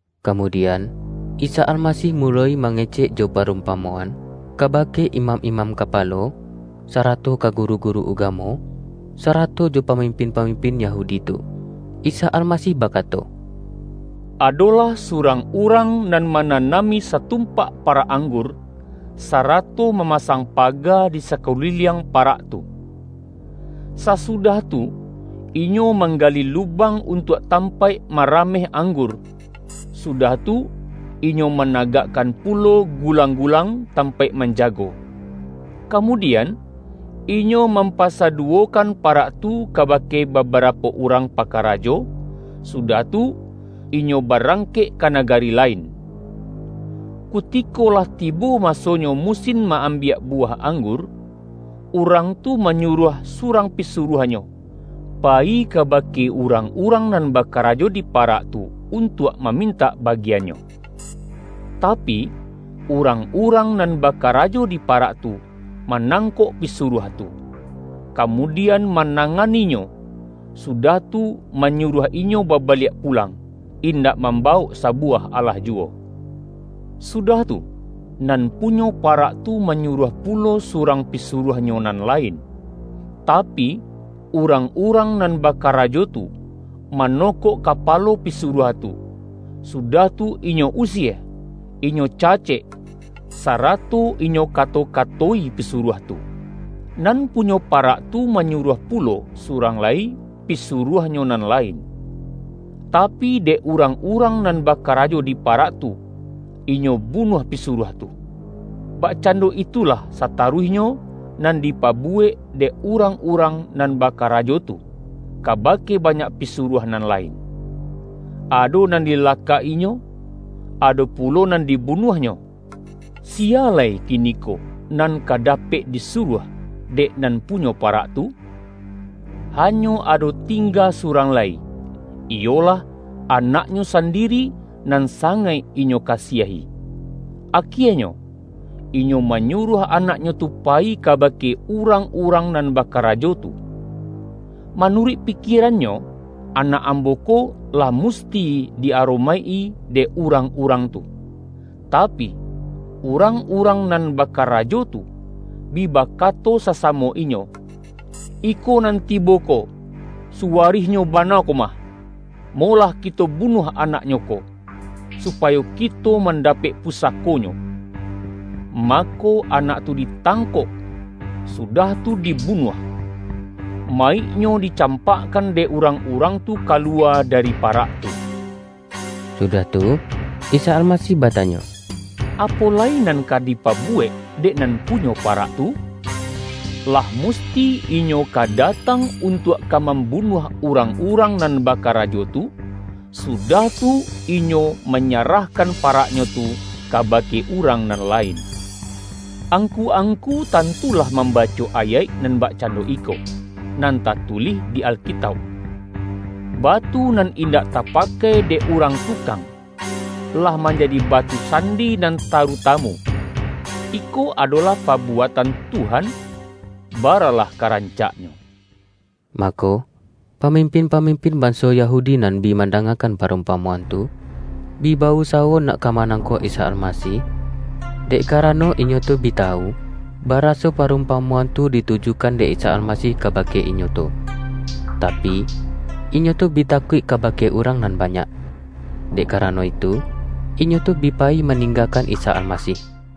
Kamudian, Isa Almasih muloi mangecek jo parumpamoan, kabake imam-imam kapalo, sarato ka guru-guru ugamo, sarato jo pamimpin-pamimpin Yahudi tu. Isa Almasih ba-kato,”Adolah surang urang nan mana-nami satumpak parak anggur, sarato mamasang paga di sakuliliang parak tu. Sasudah tu, inyo manggali lubang untuak tampaik marameh anggur, su-dah tu, inyo managakkan pulo gulang-gulang tampaik manjago. Kamudian, inyo mampasaduwokan parak tu ka-bake babarapo urang pakarajo, su-dah tu, inyo barangkek ka nagari la-in. Kutiko lah tibo masonyo musin ma-ambiak buwah anggur, urang tu manyuruah surang pisuruahnyo, pa-yi kabake urang-urang nan bakarajo di parak tu, untuak mamintak bagi-annyo. Tapi, urang-urang nan ba-karajo di parak tu, manangkok pisu-ruah tu. Kamudian mananganinyo, sudah tu, manyuruah inyo babaliak pulang, indak mambawok sabuwah alah juwo. Sudah tu, nan punyo pa-rak tu manyuruah pulo surang pisu-ruahnyo nan lain. Tapi, urang-urang nan bakarajo tu, manokok kapalo pisuruah tu, sudah tu inyo usie, inyo ca-cek, sarato inyo kato-kato-i pisuruah tu. Nan punyo parak tu manyuruah pulo, surang lai pisuruahnyo nan lain. Tapi, dek urang-urang nan bakarajo di parak tu, inyo bunuah pisuruah tu. Bakcando itulah sataruihnyo, nan di-pabuwek dek urang-urang nan baka-rajo tu, kabake banyak pisuruah nan lain: ado nan dilakak-inyo, ado pu-lo nan dibunuahnyo. Siya lai kiniko nan ka dapek disuruah dek nan pu-nyo parak tu? Hanyo ado tingga su-rang lai, iyolah, anaknyo sandiri nan sangaik inyo kasiahi. Akienyo, inyo manyuruah anaknyo tu payi kabake urang-urang nan bakarajo tu. Manu-ruik pikierannyo, ’Anak ambo ko, lah musti di aromaik-i dek urang-urang tu.’ Tapi, urang-urang nan bakarajo tu, bi bakato sasamo inyo, ’Iko nan tibo ko, suwarihnyo bana komah. Molah kito bunuah anaknyo ko, supayo kito mandapek pusakonyo!’ Mako, anak tu ditangkok, sudah tu dibunuah. Ma-yiknyo dicampakkan dek urang-urang tu kaluwa dari parak tu.” Sudah tu, Isa Almasih batanyo,”Apo lai nan ka dipabuwek dek nan punyo parak tu? Lah musti inyo ka datang untuak ka mambunuah urang-urang nan bakarajo tu, sudah tu, inyo ma-nyarahkan paraknyo tu kabake urang nan lain. Angku-angku tantu lah mambaco ayaik nan bakcando iko, nan tatulih di Alkitauk, ’Batu nan indak tapakai dek urang tukang, lah manjadi batu sandi nan tarutamu. Iko adolah pabuatan Tuhan; baralah ka rancaknyo!’” Mako, pamimpin-pamimpin ban-so Yahudi nan bi mandangakan pa-rumpamoan tu, bi ba-usawo nak ka manangkok Isa Almasih, dek karano inyo tu bi tawu, baraso parumpamo-an tu ditujukan dek Isa Almasih ka-bake inyo tu. Tapi, inyo tu bi takuik kabake urang nan banyak. Dek kara-no itu, inyo tu bi payi maninggakan Isa Almasih.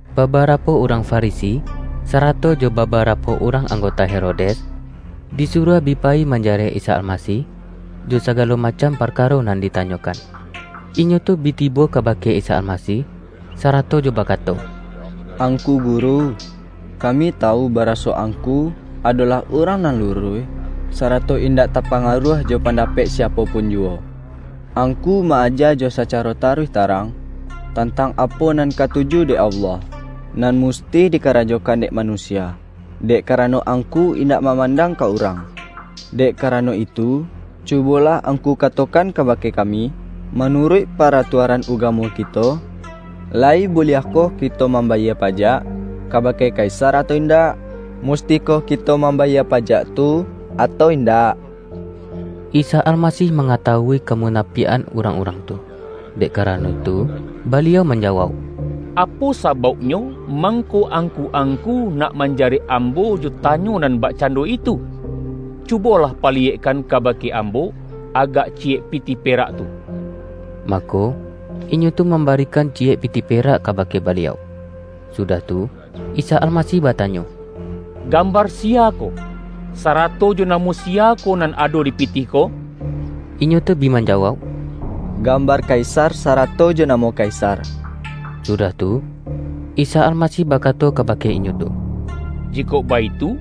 Babarapo urang Farisi, sarato jo babarapo urang anggota Herodes, di-suruah bi payi manjarek Isa Almasih, jo sagalo macam parkaro nan dita-nyokan. Inyo tu bi tibo kabake Isa Almasih, sarato jo bakato,”Angku Gu-ru, kami tawu baraso Angku adolah urang nan luruih, sarato indak tapa-ngaruah jo pandapek siapo pun juwo. Angku ma-aja jo sacaro taruih tarang, tantang apo nan katuju dek Allah, nan musti dikarajokan dek manusia, dek karano Angku indak mamandang ka urang. Dek karano itu, cubolah Angku katokan kabake kami, ’Manuruik para-tuaran ugamo kito, layi buliahkoh ki-to mambayie pajak kabake Kaisar atau indak? Mustikoh kito mambayie pajak tu, atau indak?'” Isa Almasih mangatawui kamuna-piak-an urang-urang tu. Dek karano itu, Baliau manjawauk,”Apo sabauk-nyo mangko angku-angku nak man-jarek Ambo jo tanyo nan bakcando itu? Cubolah paliyekkan kabake Ambo agak ciyek pitih perak tu.” Mako, inyo tu mambarikan ciyek pitih perak kabake Baliau. Sudah tu, Isa Almasih batanyo,”Gambar siya ko, sarato jo namo siya ko nan ado dipitih ko?” Inyo tu bi manjawauk,”Gambar Kaisar sarato jo namo Kaisar.” Sudah tu, Isa Almasih bakato kabake inyo tu,”Jikok baitu,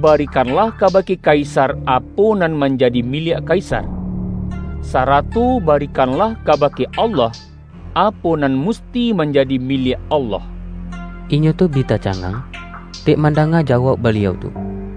bari-kanlah kabake Kaisar apo nan man-jadi miliak Kaisar, sarato barikan-lah kabake Allah, apo nan musti manjadi miliak Allah.” Inyo tu bi tacangang, dek mandanga jawauk Baliau tu.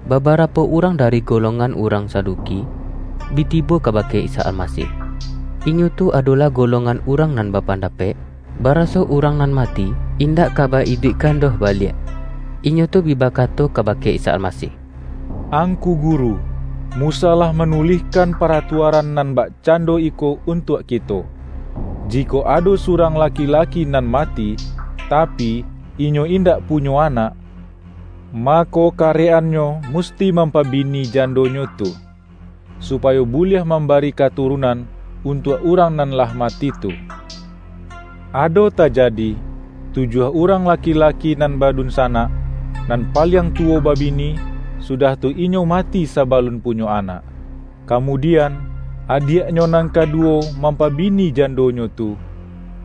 Babarapo urang dari golong-an urang Saduki, bi tibo kabake Isa Almasih. (Inyo tu adolah golongan urang nan bapandapek, baraso urang nan mati, indak ka ba-iduikkan doh baliak.) Inyo tu bi bakato kabake Isa Almasih,”Angku Guru, Musa lah manulihkan paratuaran nan bakcan-do iko untuak kito: ’Jikok ado surang laki-laki nan mati, tapi, inyo indak punyo anak, mako karek-annyo mus-ti mampabini jandonyo tu, supayo bu-liah mambari katurunan, untuak urang nan lah mati tu.’ Ado tajadi, tujuah urang laki-laki nan badunsanak. Nan paliang tuwo babini, sudah tu inyo mati sabalun punyo anak. Kamu-dian, adiaknyo nan kaduwo mampa-bini jandonyo tu,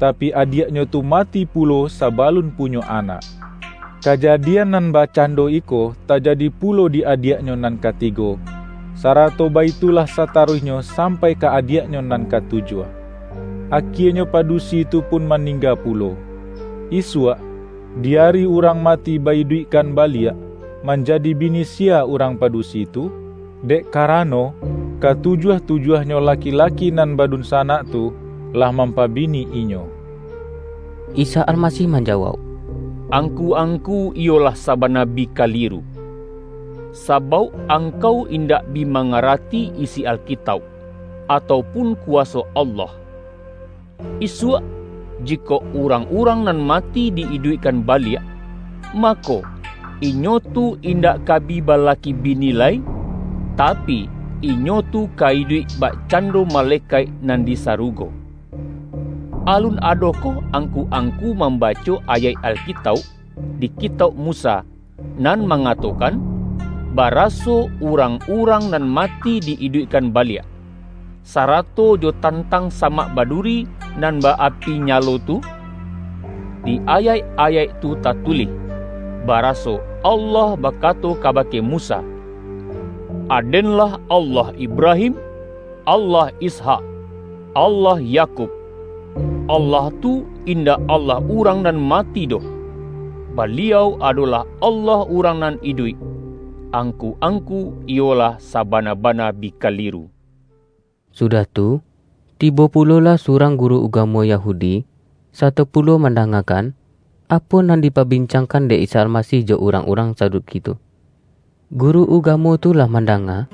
tapi, adiaknyo tu mati pulo sabalun punyo anak. Kaja-dian nan bakcando iko tajadi pulo di adiaknyo nan katigo, sarato baitu-lah sataruihnyo sampai ka adiaknyo nan katujuah. Akienyo padusi tu pun maningga pulo. Isuak, di ari urang mati ba-iduikkan baliak, manjadi bini siya urang padusi tu? Dek karano, ka-tujuah-tujuahnyo laki-laki nan badun-sanak tu, lah mampabini inyo!” Isa Almasih manjawauk,”Angku-angku iyo lah sabana bi kaliru. Sabauk angkau indak bi mangarati isi Alkitauk, atau pun kuwaso Allah. Isuak, jikok urang-urang nan mati di iduikkan ba-liak, mako, inyo tu indak ka bi bala-ki bini lai, tapi, inyo tu ka iduik bak-cando malekaik nan di sarugo. Alun adokoh angku-angku mambaco ayaik Alkitauk, di kitauk Musa nan manga-tokan, baraso urang-urang nan ma-ti di-iduikkan baliak, sarato jo tan-tang samak baduri nan ba-api nyalo tu? Di ayaik-ayaik tu tatulih, baraso Allah bakato kabake Musa, ’Aden-lah Allah Ibrahim, Allah Ishak, Allah Ya-kub.’ Allah tu, indak Allah urang nan mati doh. Baliau adolah Allah urang nan iduik. Angku-angku, iyo lah sa-bana-bana bi kaliru!” Sudah tu, tibo pulolah surang gu-ru ugamo Yahudi, sato pulo manda-ngakan, apo nan dipabincangkan dek Isa Almasih jo urang-urang Saduki tu. Guru ugamo tu lah mandanga,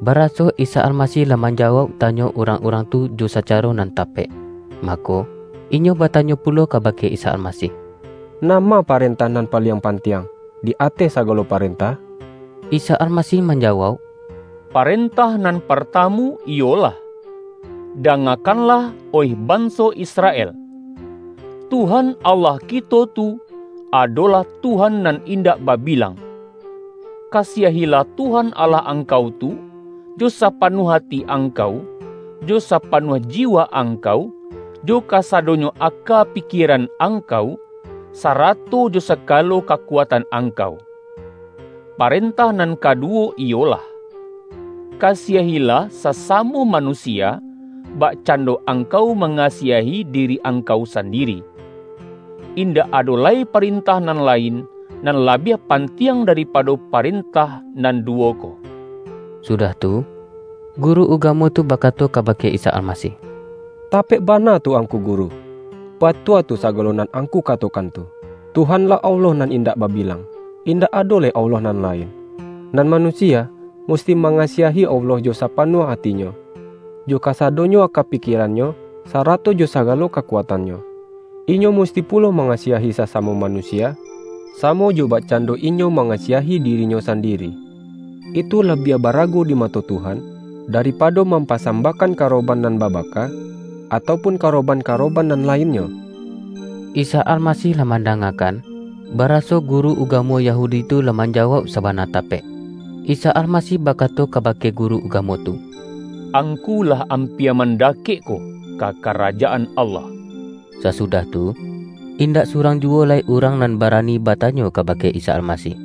bara-so Isa Almasih lah manjawauk tanyo urang-urang tu jo sacaro nan tapek. Mako, inyo batanyo pulo kabake Isa Almasih,”Nama parentah nan paliang pantiang, di ateh sagalo parentah?” Isa Almasih manjawauk,”Paren-tah nan partamu iyolah: ’Dangakan-lah, oih banso Israel! Tuhan Allah kito tu, adolah Tuhan nan indak babilang. Kasiahilah Tuhan Allah angkau tu, jo sapanuah ati angkau, jo sapanuah jiwa angkau, jo kasadonyo aka pikie-ran angkau, sarato jo sagalo kakuat-an angkau.’ Parentah nan kaduwo iyolah: ’Kasiahilah sasamo manusia, bakcando angkau mangasiahi diri ang-kau sandiri.’ Indak ado lai parentah nan lain, nan labiah pantiang daripa-do parentah nan duwo ko.” Sudah tu, guru ugamo tu bakato kabake Isa Almasih,”Tapek bana tu Angku Guru! Batua tu sagalo nan Ang-ku katokan tu: Tuhan-lah Allah nan indak babilang, indak ado lai Allah nan lain. Nan manusia, musti ma-ngasiahi Allah jo sapanuah atinyo, jo kasadonyo aka pikierannyo, sarato jo sagalo kakuatannyo. Inyo musti pulo mangasiahi sasamo manusia, samo jo bakcando inyo mangasiahi dirinyo sandiri. Itu labiah ba-arago di mato Tuhan, daripado mampasambahkan karoban nan babaka, atau pun karo-ban-karoban nan lainnyo.” Isa Almasih lah mandangakan, ba-raso guru ugamo Yahudi tu lah manja-wauk sabana tapek. Isa Almasih bakato kabake guru ugamo tu,”Angku lah am-pia mandakek ko, ka Karajaan Allah.” Sasudah tu, indak surang juwo lai urang nan barani batanyo kabake Isa Almasih.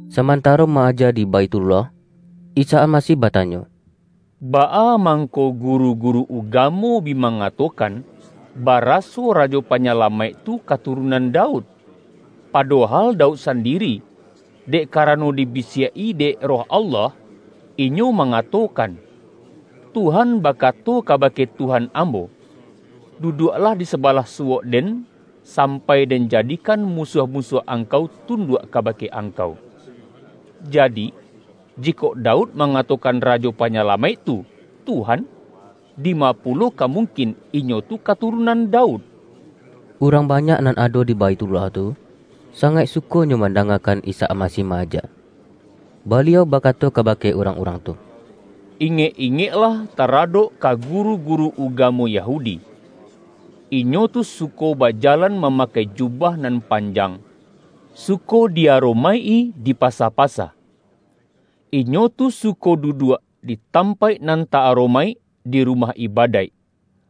Samantaro ma-aja di Baithullah, Isa Almasih batanyo,”Baa mangko guru-guru ugamo bi mangatokan, ba-raso Rajo Panyalamaik tu katurun-an Daud? Padohal Daud sandiri, — dek karano dibisiak-i dek Roh Allah, — inyo mangatokan, ’Tuhan bakato kabake Tuhan ambo: duduaklah di sabalah suwok-Den sampai Den jadikan musuah-musuah Angkau tunduak kabake Angkau.’ Jadi, jikok Daud mangatokan Rajo Panyalamaik tu, ’Tuhan', dima pulo ka mungkin Inyo tu katurunan Daud?” Urang banyak nan ado di Baithullah tu, sangaik sukonyo mandangakan Isa Almasih ma-aja. Baliau bakato ka-bake urang-urang tu,”Ingek-ingek-lah taradok ka guru-guru ugamo Ya-hudi. Inyo tu suko bajalan mamakai jubah nan panjang, suko di aromaik-i di pasa-pasa. Inyo tu suko duduak di tampaik nan ta-aromaik di rumah ibadaik,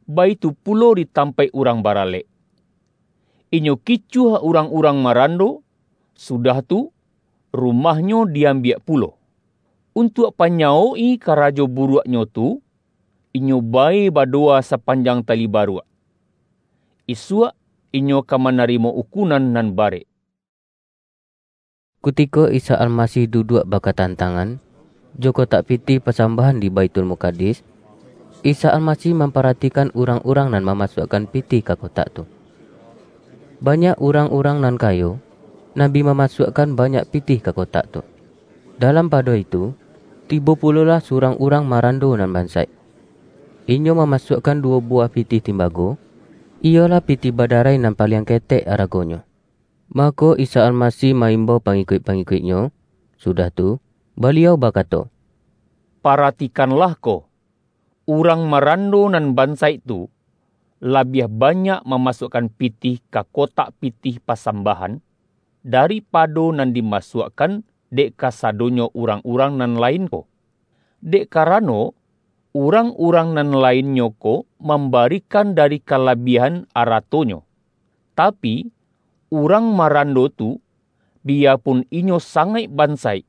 baitu pulo di tampaik urang baralek. Inyo kicuah urang-urang marando, sudah tu, rumahnyo di am-biak pulo. Untuak panyawok-i karajo buruaknyo tu, inyo bae badowa sapan-jang tali baruak. Isuak inyo ka mana-rimo ukunan nan barek!” Kutiko Isa Almasih duduak baka-tantangan, jo kotak pitih pasambahan di Baithulmukadis, Isa Almasih mam-paratikan urang-urang nan mamasuak-kan pitih ka kotak tu. Banyak urang-urang nan kayo, nan bi mamasuakkan banyak pitih ka kotak tu; dalam pa-do itu, tibo pulolah surang urang ma-rando nan bansaik. Inyo mamasuakkan duwo buwah pitih timbago, iyolah pitih badarai nan paliang ketek aragonyo. Mako Isa Almasih ma-imbau pangi-kuik-pangikuik-Nyo, sudah tu, Baliau bakato,”Paratikanlah ko: Urang ma-rando nan bansaik tu, labiah banyak mamasuakkan pitih ka kotak pitih pa-sambahan, daripado nan dimasuak-kan dek kasadonyo urang-urang nan lain ko. Dek karano, urang-urang nan lainnyo ko mambarikan dari ka-labiahan aratonyo. Tapi, urang maran-do tu, biyapun inyo sangaik bansaik,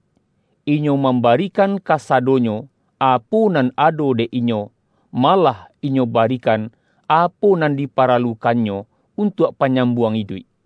inyo mambarikan kasadonyo apo nan ado dek inyo — malah inyo barikan apo nan diparalukannyo untuak panyam-buang iduik.”